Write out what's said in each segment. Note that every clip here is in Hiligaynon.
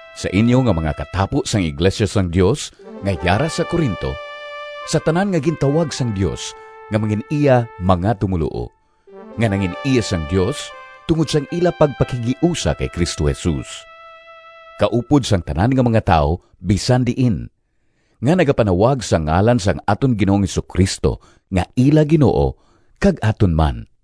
Sa inyo nga mga katapo sang iglesia sang Dios nga yara sa Corinto, sa tanan nga gintawag sang Dios nga mangin-iya mga tumoluo, nga nangin-iya sang Dios tungod sang ila pagpakighiusa kay Cristo Jesus, kaupod sang tanan nga mga tawo bisan diin, nga nagapanawag sa ngalan sang aton Ginoong Jesu-Cristo nga ila Ginoo kag aton man.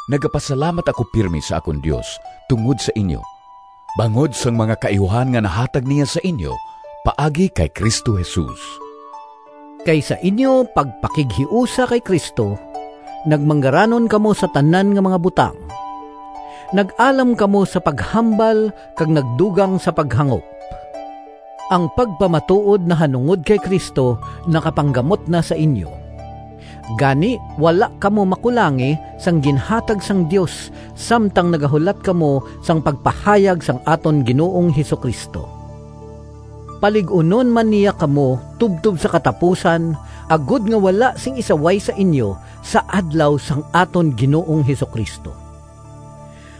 Nagapasalamat ako pirme sa akon Dios tungod sa inyo, bangod sang mga kaayuhan nga nahatag niya sa inyo paagi kay Cristo Jesus. Kay sa inyo pagpakighiusa kay Cristo nagmanggaranon kamo sa tanan nga mga butang. Nag-alam kamo sa paghambal kag nagdugang sa paghangop. Ang pagpamatuod nahanungod kay Cristo nakapanggamot na sa inyo. Gani wala kamo makulangi sang ginhatag sang Dios samtang nagahulat kamo sang pagpahayag sang aton Ginoong Jesu-Cristo. Palig-unon man niya kamo tubtob sa katapusan, agod nga wala sing isaway sa inyo sa Adlaw sang aton Ginoong Jesu-Cristo.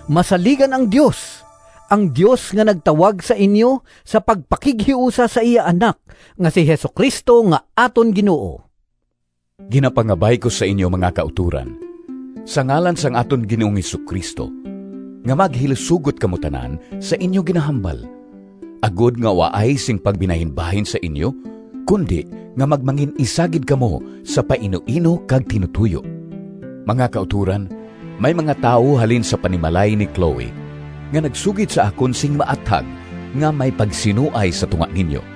Masaligan ang Dios, ang Dios nga nagtawag sa inyo sa pagpakighiusa sa iya Anak nga si Jesu-Cristo nga aton Ginoo. Ginapangabay ko sa inyo, mga kautoran, sa ngalan sang aton Ginoong Jesu-Cristo, nga maghilisugot kamo tanan sa inyo ginahambal, agod nga waay sing pagbinahinbahin sa inyo, kundi nga magmangin-isa gid kamo sa painuino kag tinutoyo. Mga kautoran, may mga tawo halin sa panimalay ni Cloe, nga nagsugid sa akon sing maathag nga may pagsinuay sa tunga ninyo.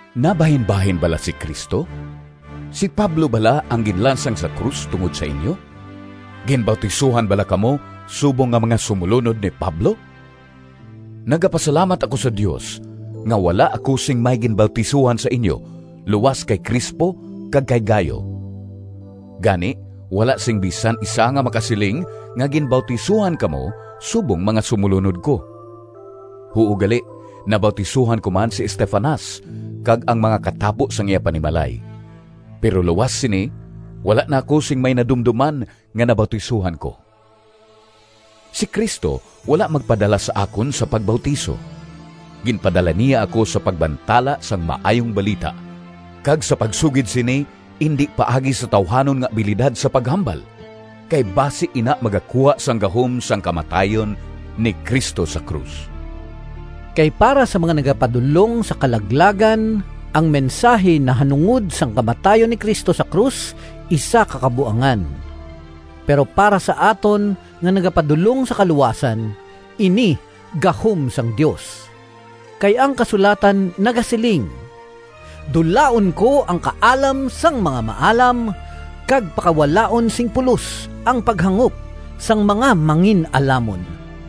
Nabahinbahin bala si Cristo? Si Pablo bala ang ginlansang sa krus tungod sa inyo? Ginbautisohan bala kamo subong nga mga sumolunod ni Pablo? Nagapasalamat ako sa Dios nga wala ako sing may ginbautisohan sa inyo luas kay Crispo kag kay Gayo. Gani, wala sing bisan isa nga makasiling nga ginbautisohan kamo subong mga sumolunod ko. (Huo gali, nabautisohan ko man si Estefanas kag ang mga katapo sang iya panimalay. Pero luas sini, wala na ako sing may nadumdoman nga nabautisohan ko.) Si Cristo wala magpadala sa akon sa pagbautiso. Ginpadala niya ako sa pagbantala sang Maayong Balita, kag sa pagsugid sini indi paagi sa tawuhanon nga abilidad sa paghambal, kay basi ina magakuha sang gahom sang kamatayon ni Cristo sa krus. Kay para sa mga nagapadulong sa kalaglagan, ang mensahi nahanungod sang kamatayon ni Cristo sa krus isa ka kabuangan, pero para sa aton nga nagapadulong sa kaluwasan, ini gahom sang Dios. Kay ang kasulatan nagasiling: “Dulaon ko ang kaalam Sang mga maalam, Kag pakawalaon sing pulos Ang paghangop Sang mga mangin-alamon.”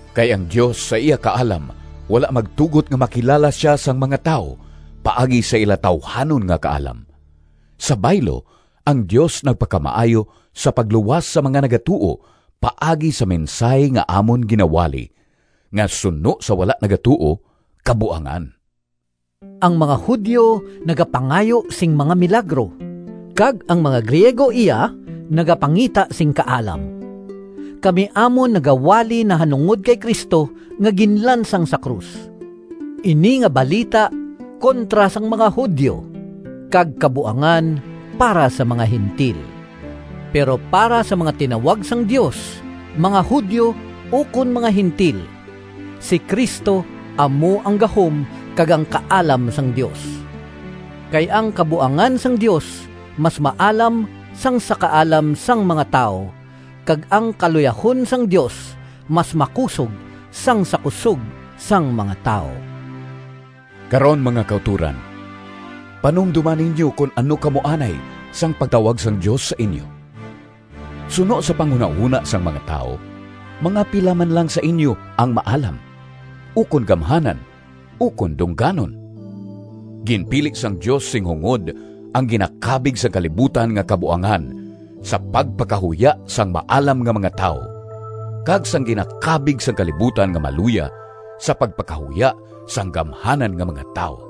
Kay ang Dios sa iya kaalam wala magtugot nga makilala sia sang mga tawo paagi sa ila tawuhanon nga kaalam. Sa baylo, ang Dios nagpakamaayo sa pagluwas sa mga nagatuo paagi sa mensahi nga amon ginawali, nga suno sa wala nagatuo, kabuangan. Ang mga Judio nagapangayo sing mga milagro, kag ang mga Griego iya nagapangita sing kaalam. Kami amon nagawali nahanungod kay Cristo nga ginlansang sa krus. Ini nga balita kontra sang mga Judio kag kabuangan para sa mga Gentil. Pero para sa mga tinawag sang Dios, mga Judio ukon mga Gentil, si Cristo amo ang gahom kag ang kaalam sang Dios. Kay ang kabuangan sang Dios mas maalam sang sa kaalam sang mga tawo, kag ang kaluyahon sang Dios mas makusog sang sa kusog sang mga tawo. Karon, mga kautoran, panumdoma ninyo kon ano kamo anay sang pagtawag sang Dios sa inyo. Suno sa panghunahona sang mga tawo mga pila man lang sa inyo ang maalam, ukon gamhanan, ukon dungganon. Ginpili sang Dios sing hungod ang ginakabig sang kalibutan nga kabuangan, sa pagpakahuya sang maalam nga mga tawo, kag sang ginakabig sang kalibutan nga maluya, sa pagpakahuya sang gamhanan nga mga tawo.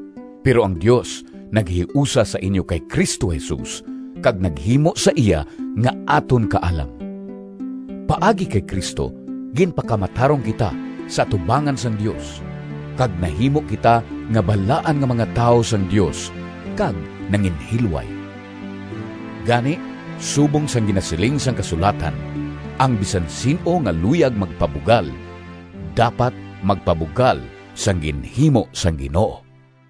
Pero ang Dios naghiusa sa inyo kay Cristo Jesus kag naghimo sa iya nga aton kaalam. Paagi kay Cristo ginpakamatarong kita sa atubangan sang Dios, kag nahimo kita nga balaan nga mga tawo sang Dios kag nanginhilway. Gani, subong sang ginasiling sang kasulatan, “Ang bisan sin-o nga luyag magpabugal, dapat magpabugal sang ginhimo sang Ginoo.”